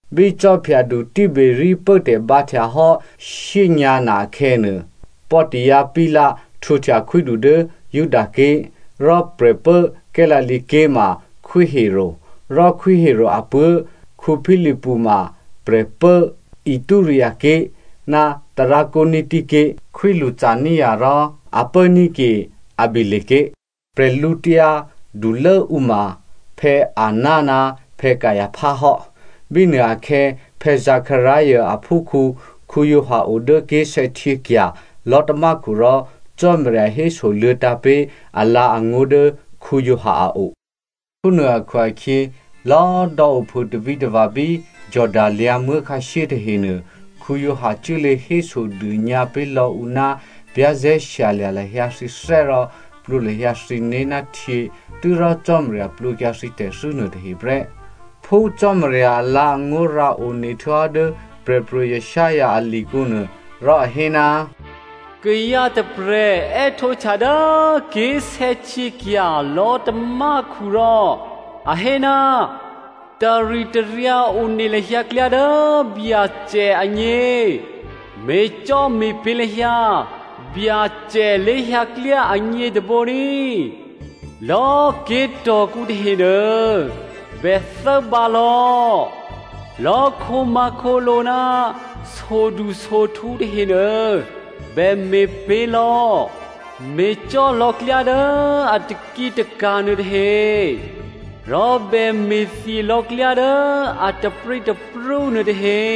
Bí Khwídu Tiberia pốtè̤ bǎhtya hò́ shyényǎ̤ na akhè̌nuô, Pontio Pilato htwǒhtya khwídu dố Judaké̤. Rò prè̤pố Galilea ké̤ ma Khwí Herodè. Rò Khwí Herodè apuố̤ Philipu ma prè̤pố Ituraea ké̤ ná Trakoniti ké̤. Khwí Lysania rò a pốní̤ ke Abilene ké̤. Prè̤lǔtyǎ dulốǔ ma Anna ná Caipha hò́. Bínuôakhè̌ Zekaria aphúkhǔ Giovanni o dố ké̤sè̌htyěkya̤ lò̤́tamákhu rò Cò́marya hésoluô̌ tǎ̤pé̤ alǎ̤angó̤ dố Giovanni a o. Phúnuô akhu-akhyě lò̌꤮ dò̌ ophû tavǐtava̤ bí Jordano lyǎ̤muố̤ khǎshyé tahenuô, Giovanni cuốlě hésodônyǎ pé̤lò̌ ǔ ná za̤ ní̤dû lahyǎ thǐné̤ rò plwǒ lahyǎ thǐné̤ ná htyě tû́rò Cò́marya plwǒkyǎ thǐ tè̤thû́ nuôtahe prè́. Phú Cò́marya alǎ̤angó̤ rǎone htuô̌hò́ dố Prè̤pro̤ Isaiah a likǔnuô, rò a hé, “Kayǎ tôprè̤ è́htǒhtya dố ké̤sè̌htyěkya̤ lò̤́tamákhu rò a hé, ‘Taritaryǎ one lahyǎ klyá dố Byacè agně. Me̤cò́me̤pě̤ lahyǎ Byacè lé̤hyǎklyá agně tôbǒ ní꤮. Lò̌꤮ ké̤tò̤kǔ tahenuô, bè thốbǎ lò̌. Lò̌꤮ khǒmǎ̤khǒlǒ ná sodusohtǔ tahenuô, bè me̤pě̤ lò̌. Me̤cò́ lò̌ klyá dố a takǐtaka̤ nuôtahe. Rò bè me̤thye lò̌ klyá dố a taprǐtaprú nuôtahe.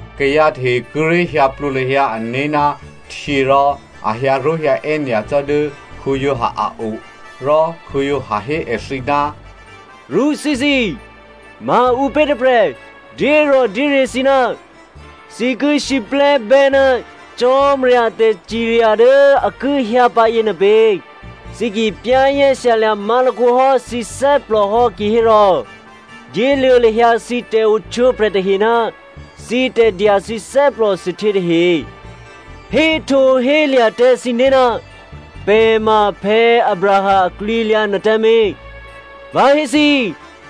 Kayǎ tahe kíré̤ hyǎ plwǒ lahyǎ ané̤ ná htyě rò a hyǎró̤hyǎè́ nyacò́ dố Giovanni a o. Rò Giovanni hé èthǐ, “Rṳ́thíthǐ꤮! Maǔpě tôprè̤ dyérò̤dyéryě̤ thǐ ná thǐ ki siplè́bè́ ná Cò́marya a tè̤cirya dố a ki hyǎpǎ yěnuô pě? Thǐ ki za̤ ní̤dû má̤lakǒ hò́ thǐné̤ hò́ kihérò dyéluô̌ lahyǎ thǐ tè̤ohtwǒprè̤ tahe ná thǐ tè̤dya thǐ thè́plòthuôhtyě tahe. Héhtǒhélya̤ tǎ thǐné̤, ‘Pè̤ ma Abraham aklwǐalyǎ’ nuôtǎmé̤. Vǎ hé thǐ,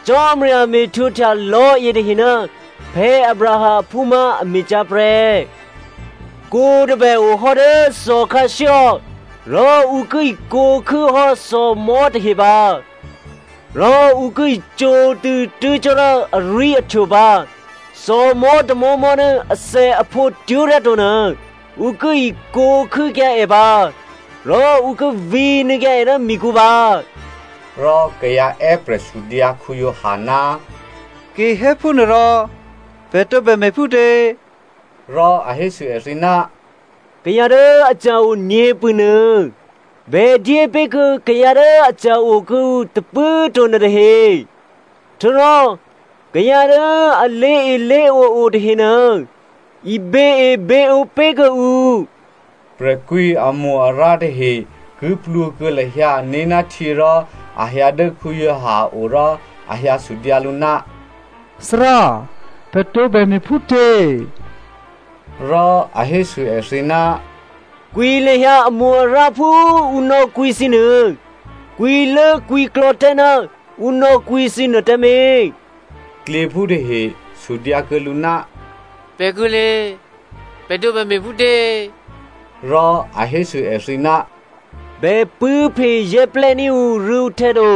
Cò́marya me̤htwǒhtya lò̤́yětahe ná Abraham aphú má̤ a me̤cyá̤ prè́. Kwǒ tôbè ohò́ dố thòkhǎshyéhò́ rò ǔ ki ikwǒ̤ khû́hò́ thòmò̤́ tahe pǎ, rò ǔ ki icǒtṳ̂̌ tuố̤ cò́ dố arwí̤ahtwo pǎ. Thòmò̤́ tômò̤́mò̤́ dố athèaphǒ twó̤ryá to nuô, ǔ ki ikwǒ̤ khû́kyǎ è pǎ rò ǔ ki vǐnuô̌kyǎ è dố mikǔ pǎ.” Rò kayǎ è́prè̤ sudyǎ Giovanni, “Ki hé phúnuôrò pè̤ tǒbè me̤phútě?” Rò a hésû èthǐ, “Kayǎ dố aca̤ o nyě̤pṳ̂nuô bè dyé pé̤ kuô̌ kayǎ dố aca̤ o kuô̌ǔ tôpṳ̂꤮ to nuôtahe. Htuô̌rò kayǎ dố a lé̤elé̤ǒ o tahenuô, iběeběǒ pé̤ kuô̌ǔ.” Prè̤kwǐamo-arǎ tahe ki plwǒ kuô̌ lahyǎ ané̤ ná htyě rò a hyǎ dố Giovanni a o rò a hyǎ sudyǎ lǔ, “Thárá, pè̤ tǒbè me̤phútě?” Rò a hésû èthǐ, “Kwǐ lahyǎ amo-arǎ phú ǔ nò̌kwǐ thǐnuô, kwǐlốkwǐklò̌ tǎ ná ǔ nò̌kwǐ thǐ nuô tǎmé̤.” Klyěphú tahe sudyǎkuô̌ lǔ, “Pè̤kuô̌lé? Pè̤ tǒbè me̤phútě?” Rò a hésû èthǐ, “Bè pṳ̂́phezè́plè́ ní̤ ǔrû̌ǔhtè̌ to.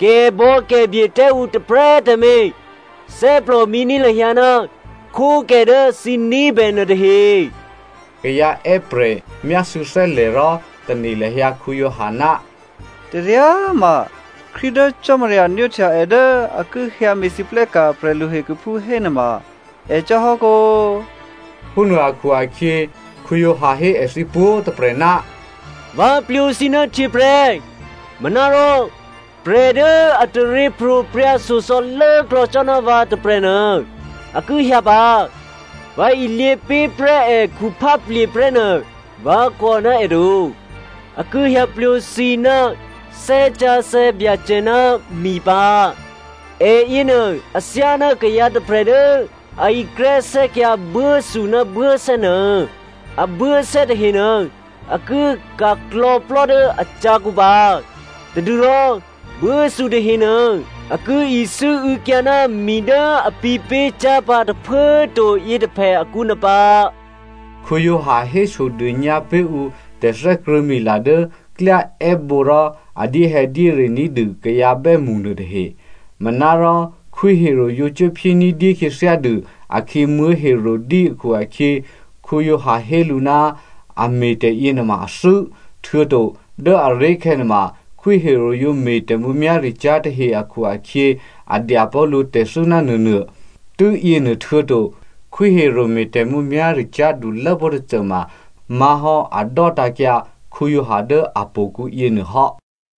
Kè̤bò̌kè̤bye tǎ ǔ tôprè̤꤮ tǎmé̤. Thè́plòmǐ ní̤ lahyǎ ná khwókè dố thǐ ní̤bè nuôtahe.” Kayǎ è́prè̤ myásû̌ thè́lè̤ rò tane̤ lahyǎ Giovanni, “Taryá꤮ ma Krístu dố Cò́marya nwóhtya è dố a ki hyǎ me̤lwóhteka̤ prè̤lu hekhuphú hénuôma è cò́ hò́ kǒ꤮.” Phúnuô akhu-akhyě Giovanni hé èthǐ pwǒ̤꤮ tôprè̤, “Vǎ plwǒ thǐ ná htyě prè́, manárò prè̤ dố a taryěpro̤prya̤ shyosò̌ lốklò̌ cò́ ná vǎ tôprè̤nuô a ki hyǎ pǎ. Vǎ ilyě pé̤prè́ è khuphá plye̤ prè́ nuô꤮ vǎ kò ná è to. A ki hyǎ plwǒ thǐ ná Thè́ Sǎsè̌ Byacè ná mi pǎ. È yěnuô athyáná kayǎ tôprè̤ dố a ikrè́sè́kyǎ buốthu ná buốsè́ nuô. Abuốsè́ tahenuô a ki ka̤klò̤̌plò́ dố acyǎkǔ pǎ, tadû́rò buốthu tahenuô a ki isû́û̌kyǎ ná mi dố a pǐ̤pé̤ cyá̤ pǎ tôphuố꤮ to yětôphè akǔ nuô pǎ.” Giovanni hésodônyǎ pé̤ ǔ tè̤thè́krṳ̂̌mila dố klyá è́bǒ rò a dyéhè̌dyére ní̤dû kayǎ bè́mṳ nuôtahe. Manárò Khwí Herodè yǒ cuốphyé ní̤dyé khyěthyádû akhǐ Herodia akhu-akhyě, Giovanni hé lǔ ná a me̤tè̤ yěnuôma a thû́. Htuô̌to dố aré̤khè̌nuô ma Khwí Herodè yǒ me̤ tè̤mǔmyá̤ricyá̤ tahe akhu-akhyě a dyapó̤ lǔ tè̤thû́ ná nuônuô. Tû́yěnuô htuô̌to, Khwí Herodè me̤ tè̤mǔmyá̤ricyá̤ dulốpó̤ tôcô ma má̤hò́ a dò́tǎ̤kyǎ Giovanni dố htò̌kǔ yěnuô hò́.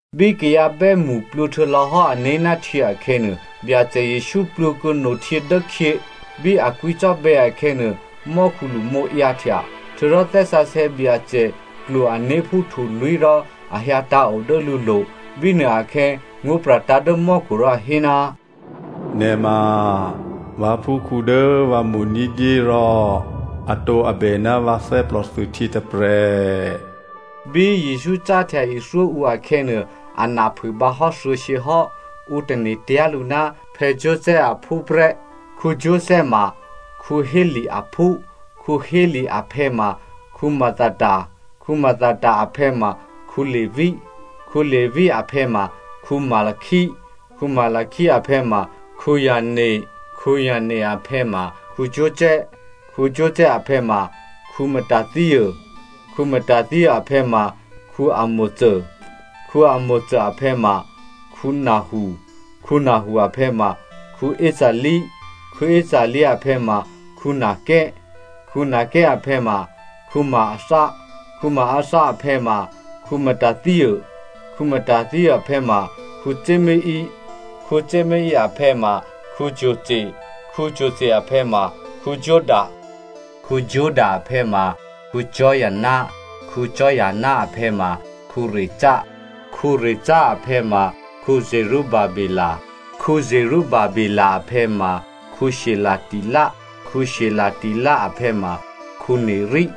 Bí kayǎ bè́mṳ plwǒ htuô̌lò̌hò́ ané̤ ná htyě akhè̌nuô, Byacè Jesǔ plwǒ kuô̌ no htyě dố khyě. Bí a kwǐcò́bè̌ akhè̌nuô, mò́khu lṳmǒ ǎyǎhtya. Htuô̌rò Thè́ Sǎsè̌ Byacè klwo ané̤ phú htulwí̤ rò a hyǎ tǎ̤o dố lǔlo̤. Bínuôakhè̌ ngó̤pra̤tǎ̤ dố mò́khu rò a hé, “Nè̤ ma vǎphúkhǔ dố vǎ mo̤ ní̤dyé rò atǒabè ná vǎ thè́plòthuôhtyě tôprè̤.” Bí Jesǔ cáhtya ithyó ǔ akhè̌nuô, a na phûbǎ hò́ thuô̌shyě hò́. Ǔ tane̤tyá̤ lǔ ná Joseph aphú prè́. Joseph ma Heli aphú, Heli aphè̌ma Mathat, Mathat aphè̌ma Levi, Levi aphè̌ma Melchi, Melchi aphè̌ma Jannai, Jannai aphè̌ma Joseph, Joseph aphè̌ma Matathia, Matathia aphè̌ma Amò, Amò aphè̌ma Nahu, Nahu aphè̌ma Esli, Esli aphè̌ ma Naggai, Naggai aphè̌ma Maatha, Maatha aphè̌ma Matathia, Matathia aphè̌ma Semein, Semein aphè̌ma Josech, Josech aphè̌ma Joda, Joda aphè̌ma Joana, Joana aphè̌ma Rhesa, Rhesa aphè̌ma Zerubabe, Zerubabe aphè̌ma Shealtiel, Shealtiel aphè̌ma Neri,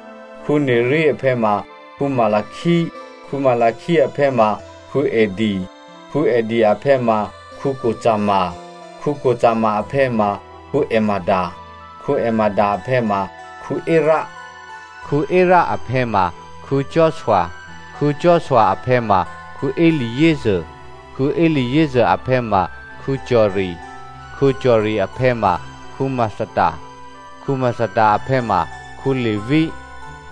Neri aphè̌ma Melchi, Melchi aphè̌ma Addi, Addi aphè̌ma Cosam, Cosam aphè̌ma Elmadam, Elmadam aphè̌ma Er, Er aphè̌ma Joshua, Joshua aphè̌ma Eliezer, Eliezer aphè̌ma Jori, Jori aphè̌ma Mathat, Mathat aphè̌ma Levi,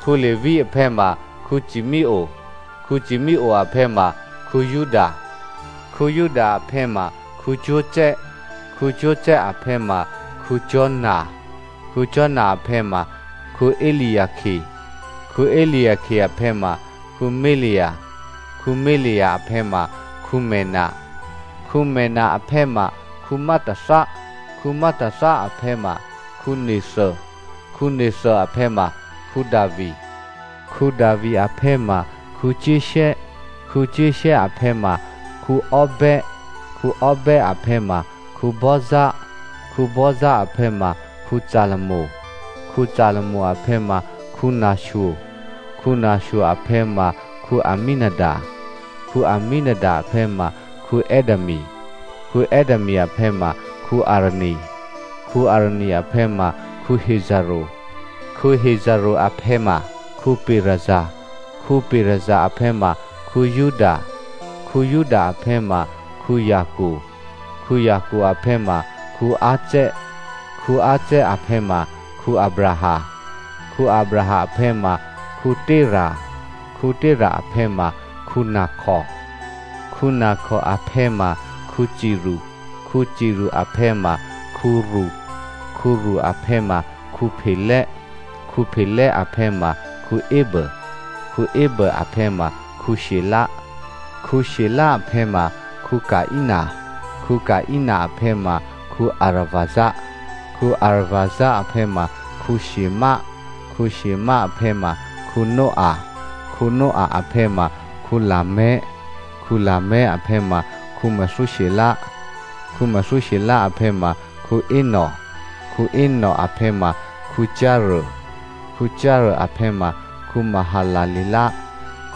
Levi aphè̌ma Simeonè, Simeonè aphè̌ma Juda, Juda aphè̌ma Joseph, Joseph aphè̌ma Jona, Jona aphè̌ma Eliakim, Eliakim aphè̌ma Melea, Melea aphè̌ma Menna, Menna aphè̌ma Matatha, Matatha aphè̌ma Natha, Natha aphè̌ma Davi, Davi aphè̌ma Jesse, Jesse aphè̌ma Obed, Obed aphè̌ma Boaz, Boaz aphè̌ma Salmon, Salmon aphè̌ma Nasho, Nasho aphè̌ma Amminadab, Amminadab aphè̌ma Admin, Admin aphè̌ma Arni, Arni aphè̌ma Hezrò, Hezrò aphè̌ma Perez, Perez aphè̌ma Juda, Juda aphè̌ma Jacob, Jacob aphè̌ma Isaac, Isaac aphè̌ ma Abraham, Abraham aphè̌ma Tera, Tera aphè̌ ma Nahor, Nahor aphè̌ma Serug, Serug aphè̌ma Reo, Reo aphè̌ma Pelè, Pelè aphè̌ma Eber, Eber aphè̌ ma Shela, Shela aphè̌ma Caina, Caina aphè̌ma Arphaxad, Arphaxad aphè̌ma Shèm, Shèm aphè̌ma Noah, Noah aphè̌ma Lamech, Lamech aphè̌ma Methusela, Methusela aphè̌ma Enoch, Enoch aphè̌ma Jare, Jare aphè̌ma Mahalaleel,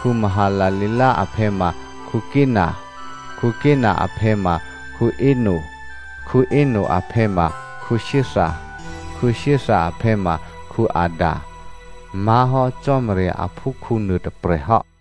Mahalaleel aphè̌ma Caina, Caina aphè̌ma Eno, Eno aphè̌ma Sèth, Sèth aphè̌ma Adam má̤hò́ Cò́marya aphúkhǔ nuôtôprè̤ hò́.